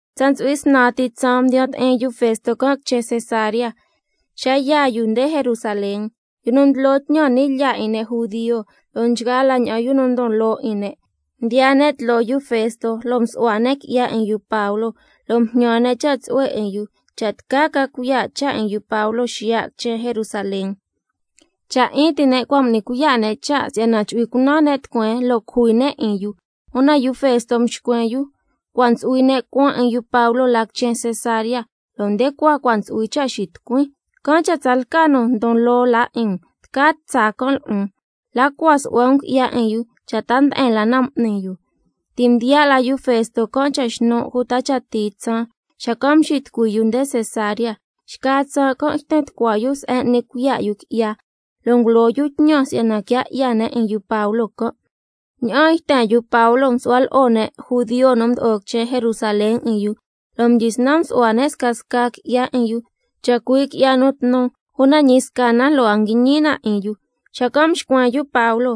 Tsa ntsu'hui snan ti tsaan mdiya ti'in yu Festo can' quichen Cesarea, xa yaa yu nde Jerusalén. Yu nu ndlo tñan ni' lyaa 'in ne' judio, lo'o nchgaa la ña'an yu nu ndon loo 'in ne', mdiyaa ne' tloo yu Festo se'en nu su'hua ne' qui'ya 'in yu Pablo, lo' mjñan ne' cha' tsu'hue 'in yu, cha' tca ca cuiya' cha' 'in yu Pablo xiya' quichen Jerusalén. Cha' 'in ti ne' cua' m'ni cuiya' ne' cha' si'yana chu'hui cunan ne' tucueen, lo' cujui ne' 'in yu. Una yu Festo mxcuen yu: Cua' ntsu'hui ne' cuan 'in yu Pablo la quichen Cesarea, lo' nde cua cua' ntsu'hui cha' xitucuin. Can' cha' tsalca nu ndon loo la 'in um, tca tsaa can' lo'on, la cua su'hua can' qui'ya 'in yu cha' ta nde'en la na m'ni yu. Ti' mdiya' la yu Festo can' cha xnu' uta cha tii tsaan, xacan' mxitucui yu nde quichen Cesarea. Xca tsaan can' yten tucua yu se'en n'ni cuiya' yu qui'ya, lo' ngulo yu tñan si'yana quia 'ya ne' 'in yu Pablo can'. Ña'aan yten yu Pablo msu'hua lo'o ne' judio nu mdo'o quichen Jerusalén 'in yu, lo' mdyisnan msu'hua ne' scasca qui'ya 'in yu, chacui' qui'ya nu tnu, una ñi sca na lo' a nguñi na 'in yu. Xacan' mxcuen yu Pablo: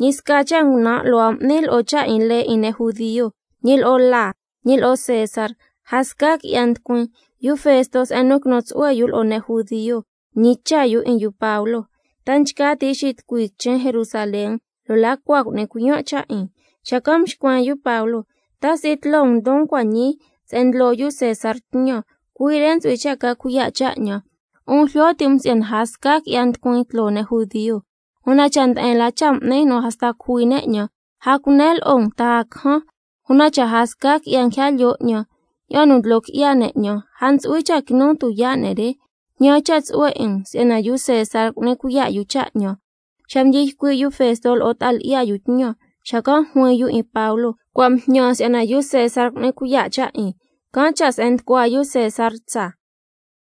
Ñi sca cha' ngunan' lo' a m'nin lo'o cha' 'in lee 'in ne' judio, ñi lo'o laa, ñi lo'o César, a sca qui'ya nducuin. Yu Festo se'en nu quinu tsu'hue yu lo'o ne' judio, mñicha' yu 'in yu Pablo: ¿Ta nchca ti' xitucui quichen Jerusalén, lo' la cua cu'nin cuiyan' cha' 'in? Xacan' mxcuen yu Pablo: ¡Ta si'i tloo um ndon cua' ñii se'en ndlo yu César tñan, cui' re ntsu'hui cha' ca cuiya' cha' 'ñan! 'Un jlyo ti' um si'yana a sca qui'ya nducuin tloo ne' judio. Una cha' nde'en la cha' m'nin nu hasta cujui ne' 'ñan, a cunen lo'o um ta a cajan. Una cha' a sca qui'ya nguija lyoo 'ñan ña'an nu ndlo qui'ya ne' 'ñan, a ntsu'hui cha' quinun tuyaa' ne' re. Jñan cha' tsu'hue 'in um si'yana yu César cu'ni cuiya' yu cha' 'ñan. Xa mdyi ycui' yu Festo lo'o ta'a lyi'ya yu tñan, xacan' juin yu 'in Pablo: Cua' mjñan si'yana yu César cu'ni cuiya' cha' 'in, can' cha' se'en nducua yu César tsaa.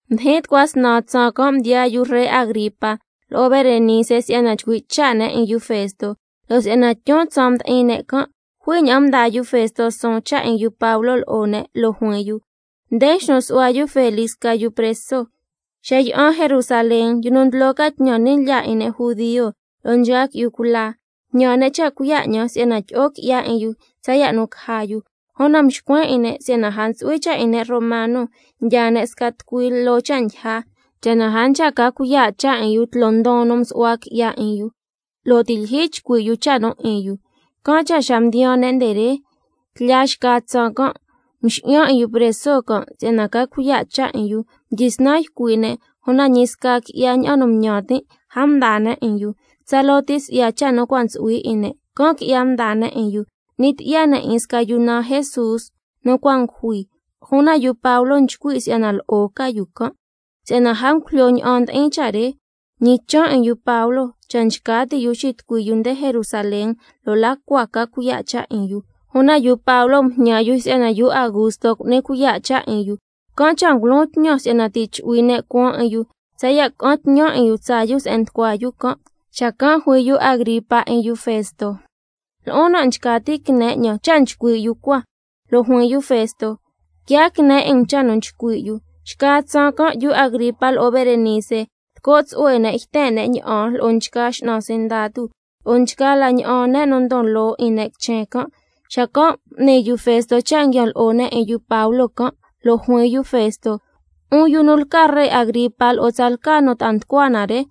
Mdijin tucua snan tsaan can', mdiyaa yu ree Agripa lo'o Berenice si'yana chcui' cha' ne' 'in yu Festo. Lo' si'yana tyun tsaan mdi'in ne' can', jui ña'an mdaa yu Festo suun cha' 'in yu Pablo lo'o ne', lo' juin yu: Nde mxnu su'hua yu Felix sca yu preso. Xa yi'an Jerusalén, yu nu ndlo ca tñan ni' lyaa 'in ne' judio, lo'o nchgaa qui'yu cula, mjñan ne' cha' cuiya' 'ñan si'yana tyi'o qui'ya 'in yu tsaya' nu caja yu. Una mxcuen 'in ne' si'yana a ntsu'hui cha' 'in ne' romano ndyaa ne' sca tucui loo cha' ndyija, cha' na a nchca ca cuiya' cha' 'in yu tloo ndon nu nsu'hua qui'ya 'in yu, lo' ti' lyijyi chcui' yu cha' nu 'in yu. Can' cha' xa mdiyaan ne' nde re, tlya xca tsaan can' mxi'yan 'in yu preso can' si'yana ca cuiya' cha' 'in yu. Mdyisnan ycui' ne', una ñi sca qui'ya ña'an nu ñan tin', a mdaa ne' 'in yu. Tsaloo si'ya cha' nu cua' ntsu'hui 'in ne', can' qui'ya mdaa ne' 'in yu. N'ni tyi'ya ne' 'in sca yu naan Jesús nu cua' ngujui, una yu Pablo nchcui' yu si'ya lo'o ca yu can'. Si'yana a ngujlyo ña'an ndi'in cha' re, can' cha' mñichan' 'in yu Pablo cha' nchca ti' yu xitucui yu nde Jerusalén, lo' la cua ca cuiya' cha' 'in yu. Una yu Pablo mjñan yu si'yana yu Augusto cu'ni cuiya' cha' 'in yu, can' cha' ngulon tñan si'yana ti' chu'hui ne' cuan 'in yu tsaya' ca'an tñan 'in yu tsaa yu se'en nducua yu can'. Xacan' yu Agripa juin yu 'in yu Festo: Lo'on nan' nchca tin' quine 'ñan cha' nchcui' yu cua. Lo' juin yu Festo: Quiaa quine 'in um cha' nu chcui' yu. Xca tsaan can' yu Agripa lo'o Berenice, lco' tsu'hue ne' yten ne' ña'an lo'o nchgaa x'nan sindatu, lo'o nchgaa la ña'an ne' nu ndon loo 'in ne' quichen can', xacan' m'ni yu Festo cha' nguian lo'o ne' 'in yu Pablo can', lo' juin yu Festo: 'Un yu nu lca ree Agripa lo'o tsalca nu ta'a nducua na re,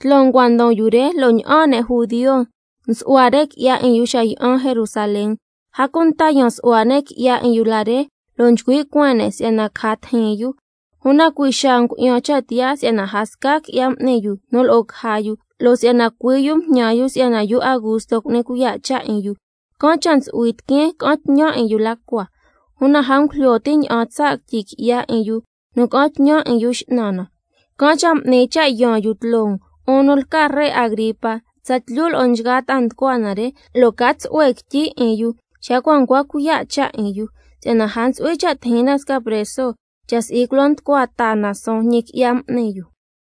tloo um cua' ndon yu re, lo' ña'aan ne' judio msu'hua qui'ya 'in yu xa yi'an Jerusalén, a cunta yan su'hua ne' qui'ya 'in yu la re, lo' nchcui' cueen ne' si'yana caja tijin yu. Una cui' xaa ngu'yan cha' tiyaa si'yana a sca qui'ya m'ni yu nu lo'o caja yu. Lo' si'yana cui' yu mjñan yu si'yana yu Augusto cu'ni cuiya' cha' 'in yu, can' cha' ntsu'hui tiqueen ca'an tñan 'in yu la cua. Una a ngujlyo tin' ña'an tsaa' quityi qui'ya 'in yu nu ca'an tñan 'in yu x'nan na, can' cha' m'nin cha' yaan yu tloo um, 'un nu lca ree Agripa tsatlyu lo'o nchgaa ta'a nducua na re, lo' ca cuiya' cha' 'in yu, xacan' caja ña'an tsaa' quityi cha' 'in yu. Si'yana a ntsu'hui cha' tijin na sca preso, cha' si'i culo nducua taa na suun ñi qui'ya m'ni yu.